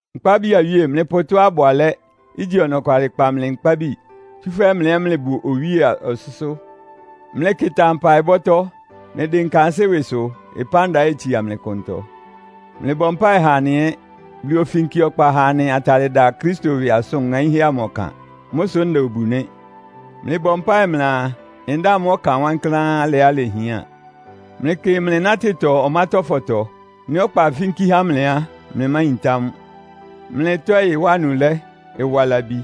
Nkpábi awíe, mlɩpʋ tɔ́á ɩbʋ alɛ́, igyi ɔnɔkwalɩ kpa mlɩ nkpábi, tsúfɛ́ mlɩ ɛ́ mlɩbʋ Owíe ɔsʋ́sʋ́. Mlɩkɩta mpaɩbɔ́tɔ́. Mlɩdɩnka ansɩ́ ɩwɩsʋ, ɩpánda ɛ́ itsia mlɩ klʋntɔ. Mlɩbɔ mpáɩ ha anɩ ɛ́. Bulu ofínki ɔkpa ha anɩ atalɩ da Kristo ɩwɩ asʋn ŋaínhɛ́ amʋ ɔkan. Mʋ́ sʋ nda obu nɩ́. Mlɩbɔ mpáɩ mlɩaa, ndáa mʋ́ ɔkan wankláán, alɩá ilehián. Mlɩkɩ mlɩ nátɩtɔ ɔmátɔ́fɔtɔ. Nɩ́ ɔkpa ifínkí há mlɩ á, mlɩmáyintá mʋ́. Mlɩ ɩtɔ́ɩ ɩwa anulɛ́, ɩwa labi,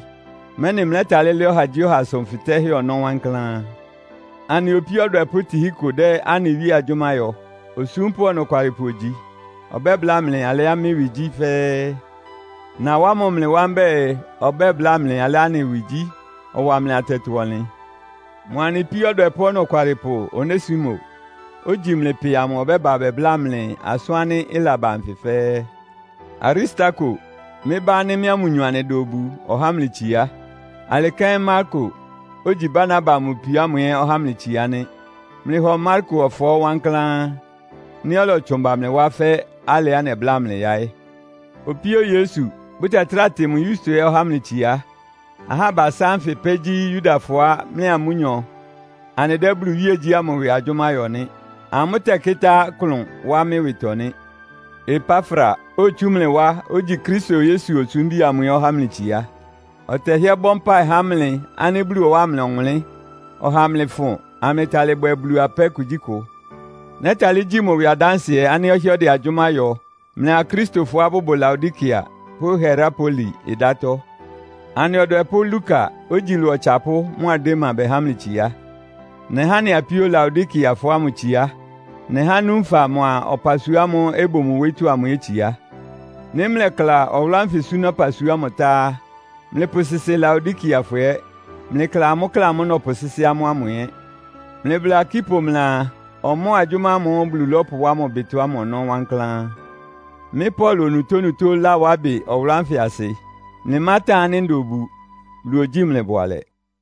mɛ́nɩ mlɛ́talɩ́ lɛ́ ɔhagyíɔha asʋn fɩtɛ́hɛ́ ɔnɔ́ wankláán. Anɩa opíó ɔdwɛpʋ́ Tihiko dɛ́ anɩ Wíe agyʋ́má yɔ. Osúmpʋ́ ɔnɔkwalɩpʋ ogyi. Ɔbɛ́bláa mlɩ alɩá mɩ́ ɩwɩ gyí fɛ́ɛ́. Nawá mʋ mlɩ wá mbɛ́ɛ, ɔbɛ́bláa mlɩ alɩá anɩ ɩwɩ gyí, ɔwa mlɩ atɛtɔ-ɔnlɩn. Mʋa anɩ píó ɔdwɛpʋ́ ɔnɔkwalɩpʋ Onesimo, ogyi mlɩ pɩ amʋ ɔbɛ́ba bɛbla mlɩ asʋ́n ánɩ́ ɩlaba nfɩ fɛ́ɛ́. Aristarko, mɩ́ bá ánɩ́ mɩ́a mʋnyɔ anɩda obu ɔhá mlɩ itsiá. Alɩ kɛ́n Marko, ogyi Barnaba mʋ pio ámʋ ɛ́ ɔhá mlɩ itsiá nɩ́. Mlɩhɔ Marko ɔfɔɔ́ wankláán, nɩ́ ɔlɔtsʋn ba mlɩ wá fɛ́ alɩá nɛbláa mlɩ yáɩ́. Opíó Yesu, bʋtɛtráa tɩ mʋ Yusto ɛ́ ɔhá mlɩ itsiá. Ahá abasá ánfɩ pɛ́ gyí Yudafɔá mɩ́a amʋ́nyɔ anɩdɛ́ Bulu iwíegyí ámʋ ɩwɩ agyʋ́má yɔ nɩ́. Amʋ́ tɛ́kɩ́tá klʋn wá mɩ́ ɩwɩtɔ nɩ́. Epafra, otsú mlɩ wá, ogyi Kristo Yesu osúmbi amʋ ɛ́ ɔhá mlɩ itsiá. Ɔtɛhɩ́ɛ́ bɔ mpáɩ há mlɩ ánɩ́ Bulu ɔwáa mlɩ ɔwʋnlɩ́n, ɔha amlɩfʋn, amlɩtalɩ bwɛ Bulu apɛ́ kugyíkʋ. Nɛ́talɩ́ gyí mʋ ɩwɩ adánsɩɛ ánɩ́ ɔhɩ́ɛ́ ɔdɛ agyʋ́má yɔ mlɩa Akristofɔá bʋbʋ Laodikea pʋ́ Hierapoli ɩdátɔ́. Anɩ ɔdwɛpʋ́ Luka, ogyi ɩlɔ ɔtsapʋ́ mʋa Dema bɛhá mlɩ itsiá. Nɛhá anɩ apíó Laodikeafɔ ámʋ itsiá. Nɛhá Nunfa mʋa ɔpasua ámʋ́ʋ́ ɩbʋ mʋ wóyítɔ́ amʋ ɛ́ itsiá. Nɩ́ mlɛkla ɔwʋlʋ́ ánfɩ súná ɔpasua ámʋ tá á, mlɩpʋsɩsɩ Laodikeafɔ ɛ́. Mlɩkla amʋ́ klɛ́ ámʋ́ʋ́ nɔpʋsɩ́sɩ́ amʋ́ ámʋ ɛ́. Mlɩbla Arkipo mlɩaa, ɔmɔ́ɔ agyʋ́má ámʋ́ʋ́ Bulu lɔ́pʋwá mʋ ɩbɩtɔ ámʋ ɔnɔ́ wankláán. Mɩ́ Paulo, onutónutó lawá ɩbɩ ɔwʋlʋ́ ánfɩ asɩ. Mlɩmátan ánɩ́ nda obu. Bulu ogyíi mlɩ bʋalɛ.